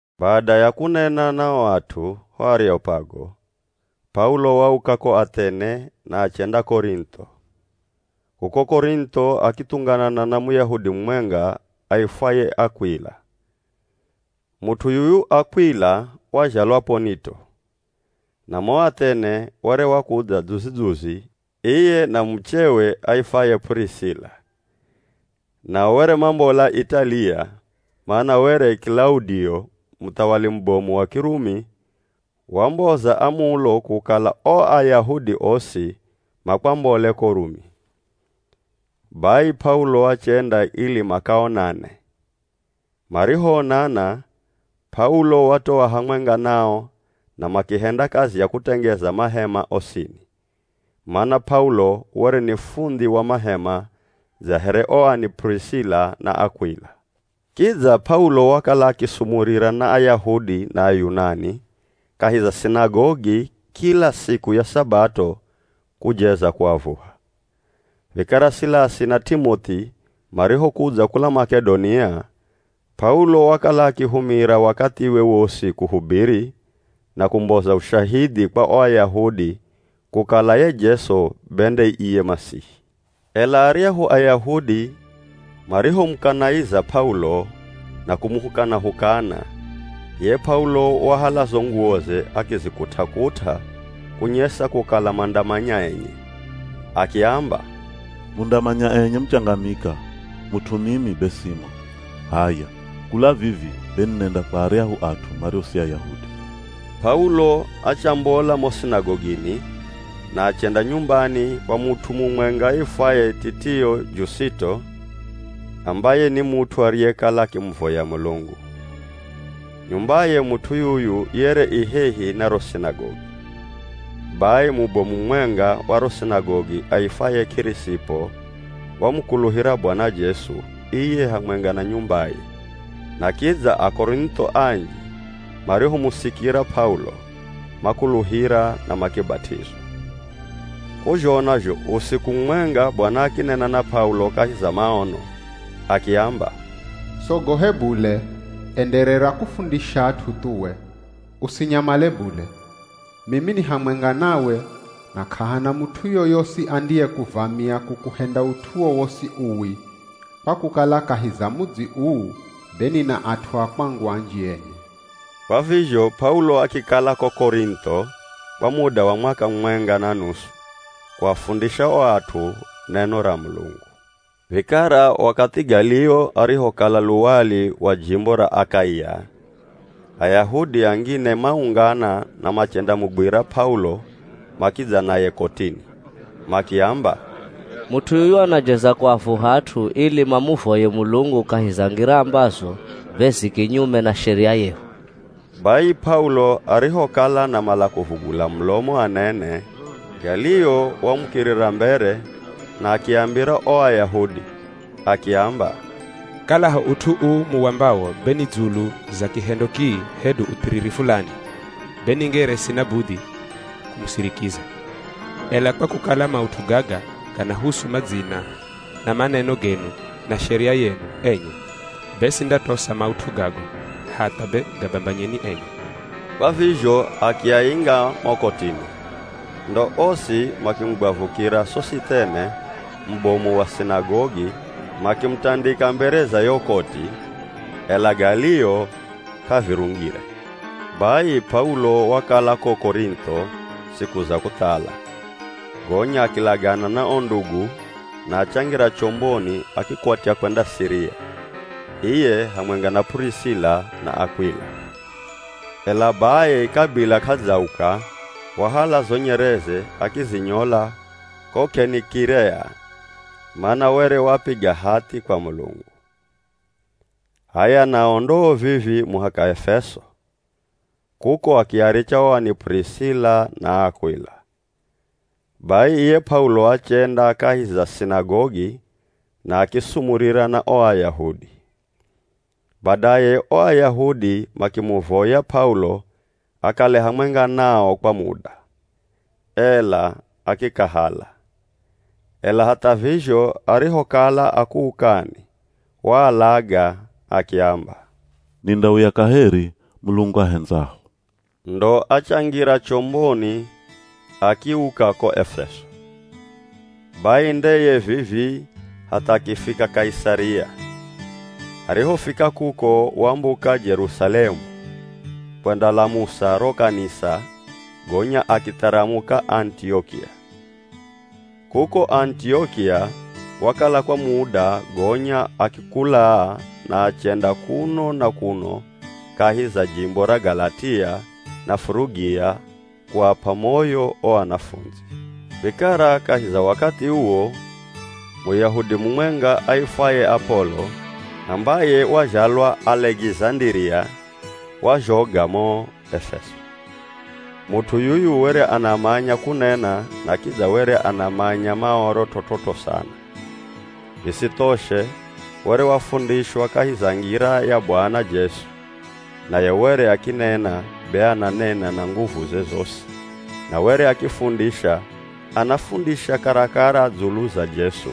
Bada ya kunena na o at'u ho Areopago, P'aulo wauka ko Athene na achenda Korintho. Kuko Korintho akithunganana na Muyahudi mumwenga aifwaye Akw'ila. Mut'u yuyu Akw'ila wazhalwa P'onito, na mo Athene were wakudza dzuzi-dzuzi iye na muchewe aifwaye P'urisila, nao were mambola Italiya, mana were Kilaudio, muthawali mubomu wa Kirumi wamboza amulo kukala o Ayahudi osi makwambole ko Rumi. Bai P'aulo achenda ili makaonane. Marihoonana, P'aulo watoa hamwenga nao na makihenda kazi ya kutengeza mahema osini, mana P'aulo were ni fundhi wa mahema dza here o ani P'urisila na Akw'ila. Kidza P'aulo wakala akisumurira na Ayahudi na Ayunani kahi za sinagogi kila siku ya Sabato kujeza kuavuha. Vikara Silasi na T'imoth'i marihokudza kula Mak'edonia, P'aulo wakala akihumira wakathiwe wosi kuhubiri, na kumboza ushahidhi kwa o Ayahudi kukala ye Jesu be nde iye Masihi. Ela aryahu Ayahudi marihomukanaiza P'aulo na kumuhukana-hukana, iye P'aulo wahala zo nguwoze akizikut'a-kut'a kunyesa kukala mandamanya enye, akiamba, “Mundamanya enye muchangamika, mut'u mimi be simo. H'aya kula vivi be ninenda kwa aryahu at'u mario si Ayahudi.” P'aulo achambola mo sinagogini na achenda nyumbani kwa mut'u mumwenga aifwaye Titio Jusito, ambaye ni mut'u ariyekala akimuvoya Mulungu. Nyumbaye mut'u yuyu yere i hehi na ro sinagogi. Bai mubomu mumwenga wa ro sinagogi aifwaye K'irisipo wamukuluhira Bwana Jesu, iye hamwenga na nyumbaye, na kidza Akorintho anji marihomusikira P'aulo, makuluhira na makibat'izwa. K'uzhona zho usiku mumwenga Bwana akinena na P'aulo kahi za maono, akiamba, “Sogohe bule, enderera kufundisha at'u thuwe, usinyamale bule Mimi ni hamwenga nawe, na k'ahana mut'u yoyosi andiyekuvamia kukuhenda ut'u wowosi uwi, kwa kukala kahi za mudzi uu be nina at'u a kwangu anji enye.” Kwa vizho P'aulo akikala ko Korintho kwa muda wa mwaka mumwenga na nusu kuafundisha o at'u neno ra Mulungu. Vikara wakathi Galio arihokala luwali wa jimbo ra Akaia, Ayahudi angine maungana na machendamugwira P'aulo makidza naye kotini. Makiamba, “Mut'u yuyu anajeza kuavuha at'u ili mamuvoye Mulungu kahi za ngira ambazo be zi kinyume na sheria yehu.” Bai P'aulo arihokala anamala kuvugula mulomo anene, Galio wamukirira mbere na akiambira o Ayahudi, akiamba, “Kalaho ut'u uu muambawo be ni dzulu za kihendo kii hedu uthiriri fulani, be ningere sina budhi kumusirikiza. Ela kwa kukala maut'u gaga ganahusu madzina na maneno genu na sheria yenu enye, be sindatosa maut'u gago, hatha be gabambanyeni enye.” Kwa vizho akiainga mo kotini. Ndo osi makimugwavukira Sosithene, mubomu wa sinagogi makimutandika mbere za yo koti, ela Galio k'avirungire. Bai P'aulo wakala ko Korintho siku za kuthala, gonya akilagana na o ndugu na achangira chomboni akikwatya kwenda Siria, iye hamwenga na P'urisila na Akw'ila. Ela bai kabila k'adzauka wahala zo nyereze akizinyola ko K'enikirea, mana were wapiga hathi kwa Mulungu. H'aya nao ndoo vivii muhaka Efeso, kuko akiaricha o ani P'urisila na Akw'ila. Bai iye P'aulo achenda kahi za sinagogi na akisumurira na o Ayahudi. Badaye o Ayahudi makimuvoya P'aulo akale hamwenga nao kwa muda, ela akikahala. Ela hatha vizho arihokala akuukani waalaga akiamba, “Nindauya kaheri Mulungu ahendzaho.” Ndo achangira chomboni akiuka ko Efeso. Bai ndeye vivii, hatha akifika Kaisaria, arihofika kuko wambuka Jerusalemu kwendalamusa ro kanisa gonya akitharamuka Anitiokia. Kuko Anitiokia wakala kwa muda gonya akikulaa na achenda kuno na kuno kahi za jimbo ra Galatia na Furugia kuap'a moyo o anafundzi. Vikara kahi za wakathi uwo Muyahudi mumwenga aifwaye Apolo, ambaye wazhalwa Alekizandiria wazhoga mo Efeso. Mut'u yuyu were anamanya kunena na kidza were anamanya Maoro t'ot'ot'o sana. Visithoshe, were wafundishwa kahi za ngira ya Bwana Jesu, naye were akinena be ananena na nguvuze zosi na were akifundisha anafundisha karakara dzulu za Jesu,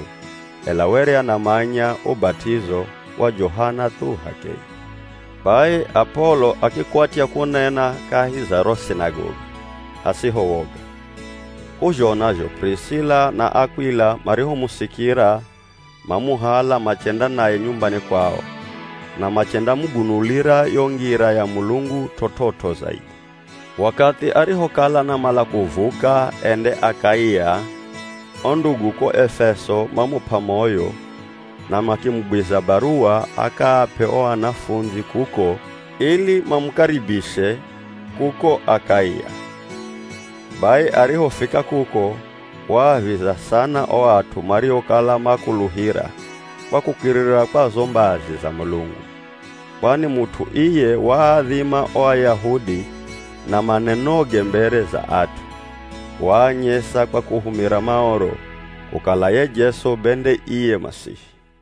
ela were anamanya ubat'izo wa Johana thu h'akeye. Bai Apolo akikwatya kunena kahi za ro sinagogi hasiho woga. K'uzhona zho P'urisila na Akw'ila marihomusikira mamuhala machenda naye nyumbani kwao na machendamugunulira yo ngira ya Mulungu t'ot'ot'o zaidhi. Wakathi arihokala anamala kuvuka ende Akaia o ndugu ko Efeso mamup'a moyo na makimugwiza baruwa akaap'e o anafundzi kuko ili mamukaribishe, kuko Akaia. Bai arihofika kuko waaviza sana o at'u mariokala makuluhira kwa kukirira kwa zo mbazi za Mulungu, kwani mut'u iye waadhima o Ayahudi na manenoge mbere za at'u, waanyesa kwa kuhumira Maoro, kukala ye Jesu be nde iye Masihi.